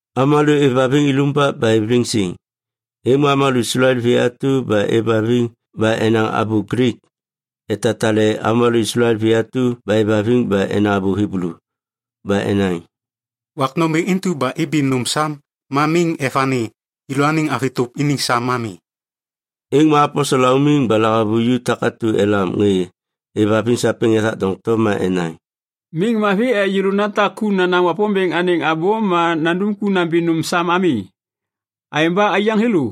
Avômalô êvhaviŋ ilumbak ba êv liŋ siŋ, êŋ ma avômalô Islael vi atu ba êvhaviŋ ba enaŋ abô Glik, etatale avômalô Islael vi atu ba êvhaviŋ ba enaŋ abô Hiblu. Ba enaŋ, “Wak nômbêŋ intu ba ibi nôm sam ma miŋ evani yêlôaniŋ avi tôp iniŋ sam ami.” Êŋ ma aposel laumiŋ ba lahavuju takatu elam ŋê êvhaviŋ sapêŋ ethak doŋtom ma enaŋ, “Miŋ mavi ek yêlô natak ku nanaŋ Wapômbêŋ anêŋ abô ma nandum ku nambi nôm sam ami. Aêŋ ba, aiyaŋ thêlô,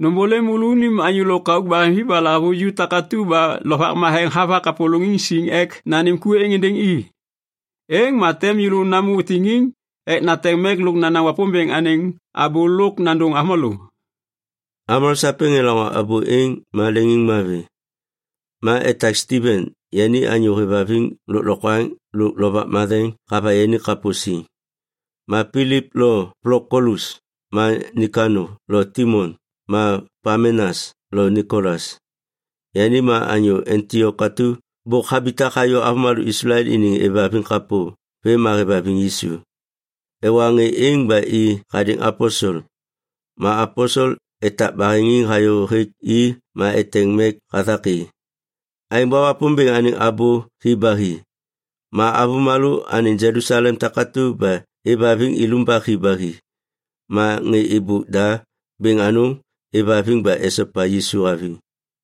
nômbôlêm môlônim anyô lôkauk baheŋvi ba lahavuju takatu ba Lovak Matheŋ hava kapôlôŋiŋ siŋ ek nanêm ku êŋ êndêŋ i. Êŋ ma tem yêlô hatôm namô tiŋiŋ ek nateŋ mek lôk nanaŋ Wapômbêŋ anêŋ abô lôk nandôŋ avômalô.” Avômalô sapêŋ elaŋô abô êŋ ma leŋiŋmavi. Ma etak Stiven, yani anyô hêvhaviŋ lôklokwaŋ lôk Lovak Matheŋ hava yani kapô siŋ, ma Pilip lôk Plokolus ma Nikano lo Timon ma Pamenas lo Nikolas, yani ma anyô Antiok atu bôk habitak hayô avômalô Islael iniŋ êvhaviŋ kapô vêm ma hêvhaviŋ Yisu. Ewa ŋê êŋ ba i hadêŋ aposel. Ma aposel etak baheŋiŋ hayô hêk i ma eteŋ mek hathak i. Aêŋ ba Wapômbêŋ anêŋ abô hi ba hi. Ma avômalô anêŋ Jelusalem takatu ba êvhaviŋ ilumbak hi ba hi. Ma ŋê êbôk da bêŋ anôŋ êvhaviŋ ba esopa Yisu haviŋ.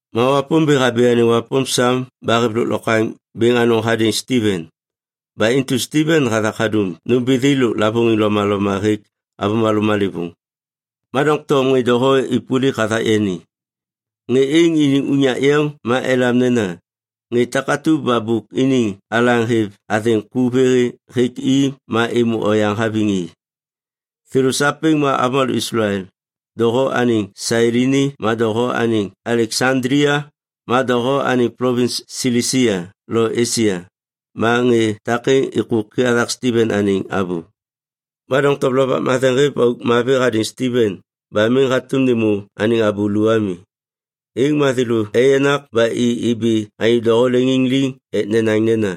Ma Wapômbêŋ habi anêŋ wapôm sam ba hêv lôklokwaŋ bêŋ anôŋ hadêŋ Stiven. Ba intu Stiven hathak hadum nômbithi lôk lavôŋiŋ lomaloma hêk avômalô malêvôŋ. Ma doŋtom ŋê doho êpôlik hathak yani. Ŋê êŋ iniŋ unyak yeŋ ma elam nena, “Ŋê takatu ba bôk iniŋ alaŋ hêv athêŋ ku vê hêk i ma êmô oyaŋ haviŋ i”. Thêlô sapêŋ ma avômalô Islael, doho anêŋ Sailini ma doho anêŋ Aleksandlia ma doho anêŋ plovins Silisia lo Esia. Ma ŋê takêŋ êkôki hathak Stiven anêŋ abô. Ma doŋtom Lovak Matheŋ hêv auk mavi hadêŋ Stiven ba miŋ hatôm nêmô anêŋ abô lu ami. Êŋ ma thêlô eyenak ba i ibi anyô doho leŋiŋ liŋ ek nenaŋ nena,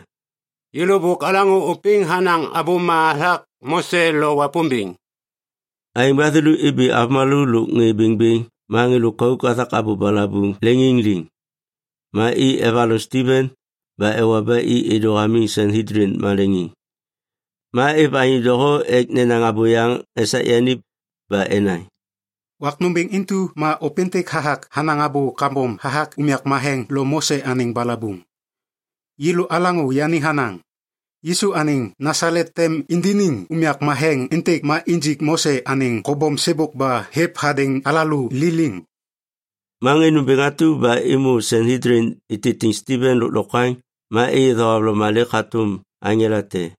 “Yêlô bôk alaŋô ôpêŋ hanaŋ abôma hathak Mose lo Wapômbêŋ.” Aêŋ ba thêlô ibi avômalô lôk ŋê bêŋbêŋ ma ŋê lôkauk hathak abô balabuŋ leŋiŋ liŋ. Ma i evaloŋ Stiven ba ewa ba i êdô hamiŋ Sanhedlin maleŋiŋ. Ma êv anyô doho ek nenaŋ abôyaŋ esak yani. Ba enaŋ, “Wak nômbêŋ intu ma ôpêntêk hathak hanaŋ abô kambom hathak unyak matheŋ lôk Mose anêŋ balabuŋ. Yêlô alaŋô yani hanaŋ, ‘Yisu anêŋ Nasalet tem indiniŋ unyak matheŋ êntêk ma injik Mose anêŋ kobom sêbôk ba hêv hadêŋ alalô liliŋ.’” Ma ŋê nômbêŋ atu ba êmô Sanhedlin ititiŋ Stiven lôklokwaŋ ma êyê thohavloma lêk hatôm aŋela te.